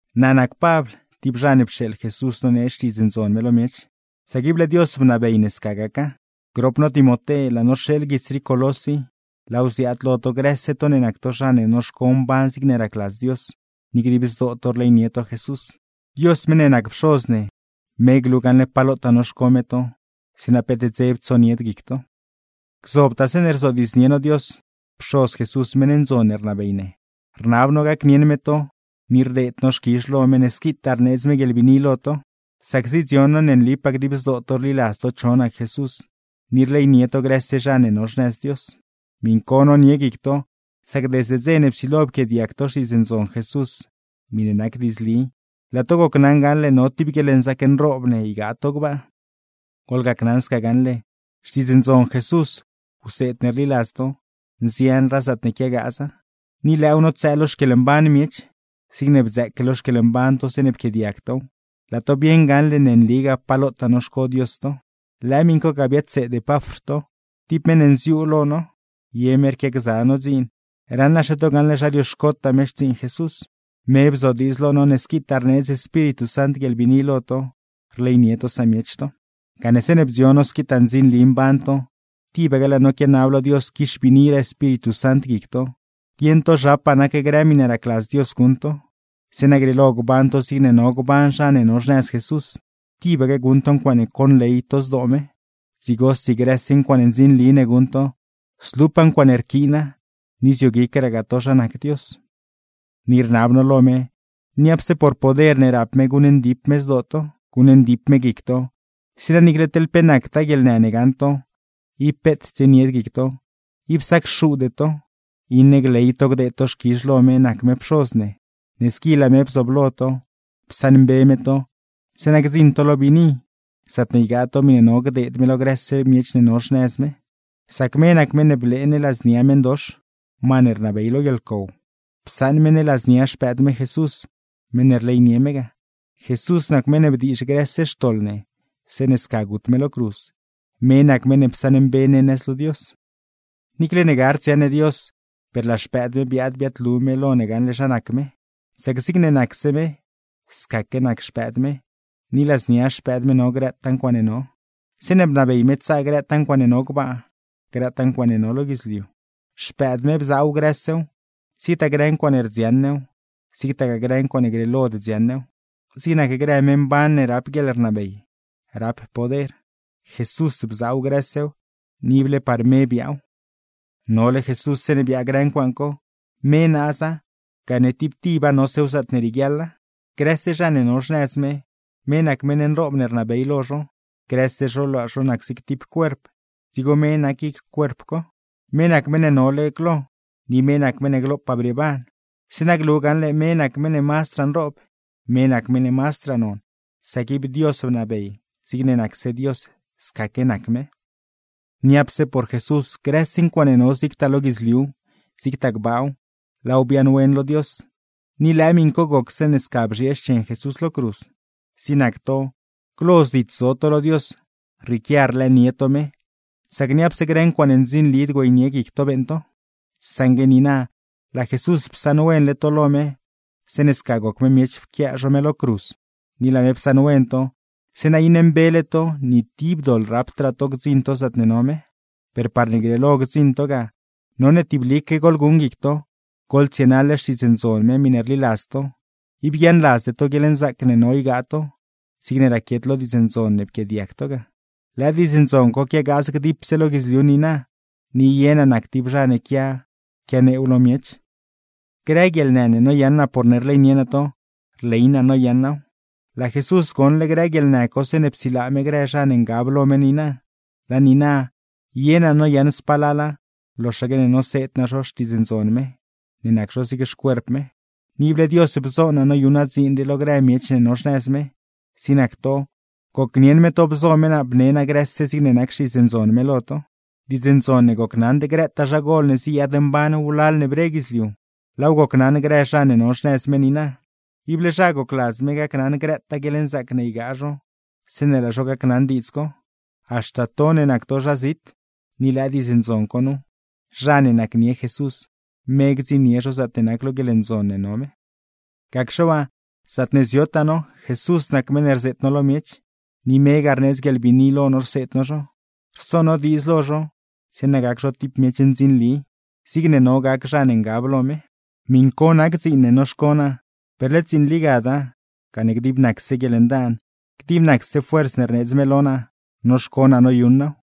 Naa nac Pabl, tib zha ne pxeeḻ Jesús nonee Xtiidz me lo miech, sac ible Dios bnabey ne sca gaca. Grop no Timoté laa no rxeeḻ guits rii Colós i, laaw ziaad lo to grëse to ne nac to zha ne noxco mban zigne racladz Dios, ni dib zdoo to rleynie to Jesús. Dios meṉ ne nac Pxoz ne, me glu gaṉle pa lotaa noxco me to, zeeṉa peet dzeb tsonied guic to. Gzobtaa zeeṉe rzodiidznie no Dios, Pxoz Jesús meṉ ndzon ne rnabey ne, rnab no gacnieṉ me to, ni rdeed no xquizh lo me ne squitaa rneedz me guieḻbiini lo to; sac zidzion no ne nlipaa dib zdoo to rliladz to cho nac Jesús, ni rleynie to grëse zha ne no xnëz Dios. Miṉ co nonie guic to, sac desde dze ne psilo pquiaadiag to Xtiidz Ndzon Jesús miṉe nac diidzli, laa to gocnaṉ gaṉle no tib guieḻnzaac nroob ne ygaa to gbaa. Goḻgacnaṉ sca gaṉle, Xtiidz Ndzon Jesús, wseed ne rliladz to, nzianraa zaatne quiagaaza, ni lëëw notsëë lo xquieḻmban miech, zigne bdzëëque lo xquieḻmban to zeeṉe pquiaadiag tow, laa to bieṉ gaṉle ne nligaa pa lotaa noxco Dios to. Lëë miṉ co ga biadseed Epafr to; tib meṉ ne nziuu lo no, ye me rquiagza no dziin; raṉaxe to gaṉle zha rioxcotaa me xtsiiṉ Jesús. Me bzodiidz lo no ne squitaa rneedz Espíritu Sant guieḻbiini lo to, rleynie to samiech to. Gane zeeṉe bdzion no squitaa ndzinli mban to, tibaque laa no quianab lo Dios quixbiiniraa Espíritu Sant guic to, guieṉ to zhapaa nac grë miṉe racladz Dios guṉ to; zeeṉa grieelo gban to zigne no gban zha ne no xnëz Jesús, tibaque guṉ to ncuaaṉe conley to zdoo me; dzigosi grëse ncuaaṉe ndzinli ne guṉ to, zlupaa ncuaaṉe rquiina, ni zioguicraa to zha nac Dios. Ni rnab no lo me, niapse por poder ne rap me guṉndip me zdoo to, guṉndip me guic to; zeeṉa niicle teḻ pe nactaa guieḻnë ne gaṉ to, ib peet tsienied guic to, ib sacxuude to, iṉe gley to gdeed to xquizh lo me nac me Pxoz ne, ne squi laa me bzooblo to, psaṉmbe me to; zeeṉa gdziṉ to lo biini zaatne ygaa to miṉe no gdeed me lo grëse miech ne no xnëz me. Sac me nac meṉ ne blee ne ladznia meṉdox, ma ne rnabey lo guieḻcow, psaṉ me ne ladznia Xpëëd me Jesús, meṉ ne rleynie me ga. Jesús nac meṉ ne bdiizh grëse xtoḻ ne zeeṉe sca gut me lo cruz, me nac meṉ ne psaṉmbe me ne nëz lo Dios. Niicle ne gard dziaṉ ne Dios, per laa Xpëëd me biaad biaadlu lo ne gaṉle zha nac me, sac zigne nacse me scaque nac Xpëëd me; ni ladznia Xpëëd me no grëtaa ncuaaṉe no. Zeeṉe bnabey me tsaa grëtaa ncuaaṉe no gbaa, grëtaa ncuaaṉe no lo guidzliu; Xpëëd me bzaaw grësew, zigtaa grë ncuaaṉe rdziaṉ new, zigtagaa grë ncuaaṉe grieelod dziaṉ new, zig nac grë “me mban” ne rap guieḻrnabey, rap poder. Jesús bzaaw grësew, ni ible par me biaaw. Nole Jesús zeeṉe biaa grë ncuaaṉ co, me naaza, gane tib tiba nosew zaatne rieguiaḻa. Ni grëse zha ne no xnëz me, me nac meṉ nroob ne rnabey lo zho; grëse zho laa zho nac zig tib cuerp, dzigo me nac guic cuerp co. Me nac meṉ ne nole glo, ni me nac meṉ ne glopaa brieeban; zeeṉa glu gaṉle me nac meṉ ne mazdraa nroob, me nac meṉ ne mazdraa non; sac ib Dios bnabey zigne nacse Dios scaque nac me. Niapse por Jesús grëse ncuaaṉe no zigtaa lo guidzliuw, zigtagaa gbaaw, laaw biaaṉwen lo Dios, ni lëë miṉ co goc zeeṉe sca bzhiee xchen Jesús lo cruz. Zig nac to, glo zit zo to lo Dios, rrieequia rlëënie to me, sac niapse grë ncuaaṉe ndzinlid güeynie guic to beeṉ to; saṉgue niina laa Jesús psaṉwenle to lo me, zeeṉe sca goc me miech pquiaa zho me lo cruz. Ni laa me psaṉwen to, zeeṉa iṉe mbele to, ni tib doḻ rapdraa to gdziṉ to zaatne no me. Per parne grieelo gdziṉ to ga, none tiblique goḻguṉ guic to, goḻtsienaḻ Xtiidz Ndzon me miṉe rliladz to, ib guiaaṉladzde to guieḻnzaac ne no ygaa to, zigne raquiet lo Diidz Ndzon ne pquiaadiag to ga. Lëë Diidz Ndzon co quiagaaz dipse lo guidzliu niina, ni ye naa nac tib zha ne quia quianeew lo miech. Grë guieḻnë ne noyaṉ naa porne rleynie naa to, rley naa noyaṉ naaw. Laa Jesús goṉle grë guieḻnë co zeeṉe psilaa me grë zha ne ngab lo me niina, laa niina ye naa noyaṉ spalala, loxaque ne noseed naa zho Xtiidz Ndzon me, ne nac zho zig xcuerp me. Ni ible Diosgaa bzo naa noyuṉ naa dziin lo grë miech ne no xnëz me, zig nac to, gocnieṉ me to bzo me naa bne naa grëse zigne nac Xtiidz Ndzon me lo to. Diidz ndzon ne gocnaṉd grëtaa zha gol ne ziyaadmban wlal ne bre guidzliu, laaw gocnaṉ grë zha ne no xnëz me niina. Ible zha gocladz me gacnaṉ grëtaa guieḻnzaac ne ygaa zho zeeṉe laa zho gacnaṉ diidz co; haxta to ne nac to zha zit. Ni lëë diidz ndzon co nu: Zha ne nacnie Jesús, me gdziṉnie zho zaatne nac lo guieḻndzon ne no me. Gacxe waa, zaatne ziotaa no, Jesús nac meṉ ne rzeet no lo miech, ni megaa rneedz guieḻbiini lo no rseed no zho, rso no diidz lo zho; zeeṉa gac zho tib miech ndzinli, zigne no gac zha ne ngab lo me. Miṉ co nac dziin ne noxco naa, per led dziin ligada, gane dib nacse guieḻndaan, dib nacse fuerz ne rneedz me lo naa, noxco naa noyuṉ naaw.